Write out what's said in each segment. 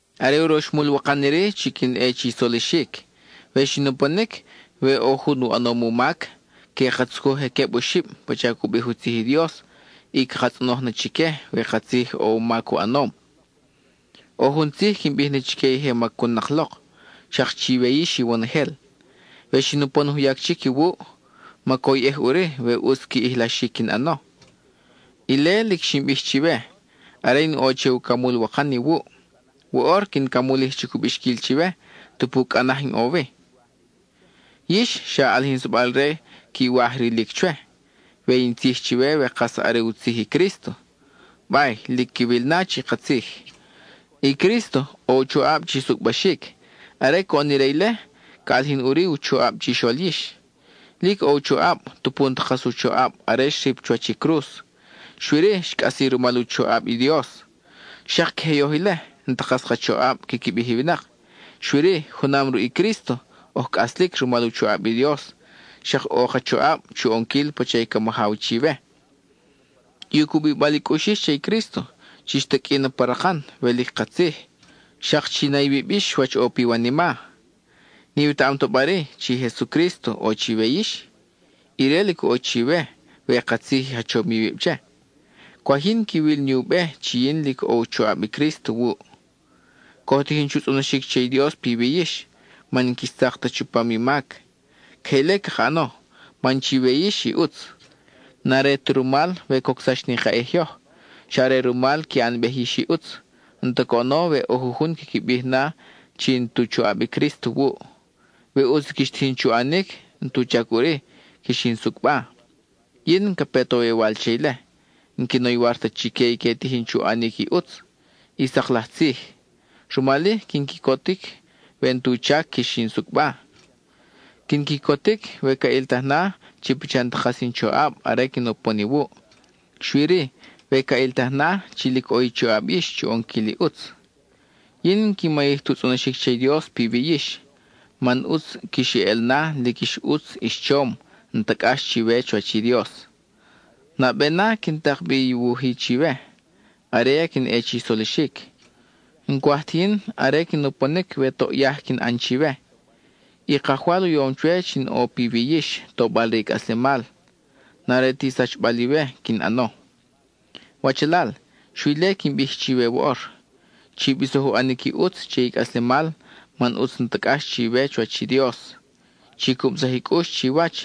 Are uroxmul wakan iri chi quin ʼe chi solixic. We xin uponic, we ʼo jun u ʼanom u mac, que ka tzucuj je queb oxib (pacha cu bij u tzij i Dios), y caka tzʼonoj na chique we katzij ʼo u mac u ʼanom. ʼO jun tzij quin bij na chique i je macunnak lok, xak chiwe yix iwonojel: we xin upon juyac chic iwuʼ, macoyʼej ʼuri we ʼutz qui ʼijlaxic quin ʼano. Ile lic xin bij chiwe, are in ʼo che ucamul wakan iwuʼ. Woʼor, quin camulij chubi u bixquil chiwe, tupu cʼa naj in ʼo wi. Yix, xa ʼalijinsabal-re quiwaj rilic chwe, we in tzij chiwe we kas are u tzij i Crísto; bay, lic quiwil na chi katzij. I Crísto, ʼo u choʼab chi sucʼbaxic; are coʼon ire ile, ca ʼalijin ʼuri u choʼab chixol yix. Lic ʼo u choʼab tupu n-ta kas u choʼab are xrip chuwach i cruz; xui-ri xcʼasi rumal u choʼab i Dios. Xak queje yoj ile; n-ta kas ka choʼab quiqui bij i winak, xui-ri, junam ruʼ i Crísto, oj cʼaslic rumal u choʼab i Dios, xak ʼo ka choʼab chu ʼonquil pacha i ca majaw chiwe. I u cubibal i cʼux yix che i Crísto, chix taqʼui na pa rakan, we lic katzij; xak chi na iwib yix wach ʼo piwanima. ¿N-iwetaʼam ta ba-ri, chi Jesucrísto ʼo chiwe yix? Ire lic ʼo chiwe we katzij i jachom iwib che. Cwaj yin quiwil ni u be chi yin lic ʼo u choʼab i Crísto wuʼ. Coj tijin chu tzʼonoxic che i Dios piwi yix, man n-quix tzak ta chupam i mac. Queje ile caka ʼano, man chiwe yix i ʼutz; n-are ta rumal we cocsax ni ka ʼij yoj; xa are rumal qui ʼanbej yix i ʼutz. N-ta coʼono we ʼo jujun quiqui bij na chi n-tu choʼab i Crísto wuʼ. We ʼutz i quix tijin chu ʼanic, n-tu chac ʼuri quix in sucʼba. Yin n-ca pe ta woywal che ile; n-quin oywar ta chique i que tijin chu ʼanic i ʼutz, i sak laj tzij. Rumal-i, quin quicotic we n-tu chac quix in sucʼba; quin quicotic we ca ʼiltaj na chi pacha n-ta kas in choʼab are quin upon iwuʼ, xui-ri, we ca ʼiltaj na chi lic ʼo i choʼab yix chu ʼonquil i ʼutz. Yin n-quin mayij tu tzʼonoxic che i Dios piwi yix; man ʼutz quix eʼel na lic ix ʼutz ix chom, n-ta cʼax chiwe chuwach i Dios. Nabe na quin tak bi i wuj-i chiwe, are ya quin ʼe chi solixic; n-cwaj ti yin are quin uponic we toʼ yaj quin ʼan chiwe. I Kajwal u yom chwe chi in ʼo piwi yix tobal re i cʼaslemal, n-are ti sachbal iwe quin ʼano. Wachalal, xui ile quin bij chiwe woʼor. Chi bisoj u ʼanic i ʼutz che i cʼaslemal man ʼutz n-ta cʼax chiwe chuwach i Dios; chi cubsaj i cʼux chiwach;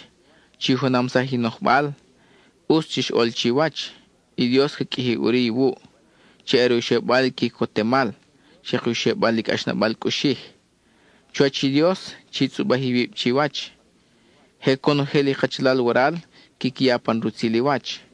chi junamsaj i nojbal; ʼutz chix ʼol chiwach. I Dios ca qʼuiji ʼuri iwuʼ, chi are u xebal i quicotemal, xak u xebal i cʼaxnabal cʼuxij. Chuwach i Dios, chi tzʼubaj iwib chiwach. Je conojel i kachalal waral quiqui ya pan rutzil i wach.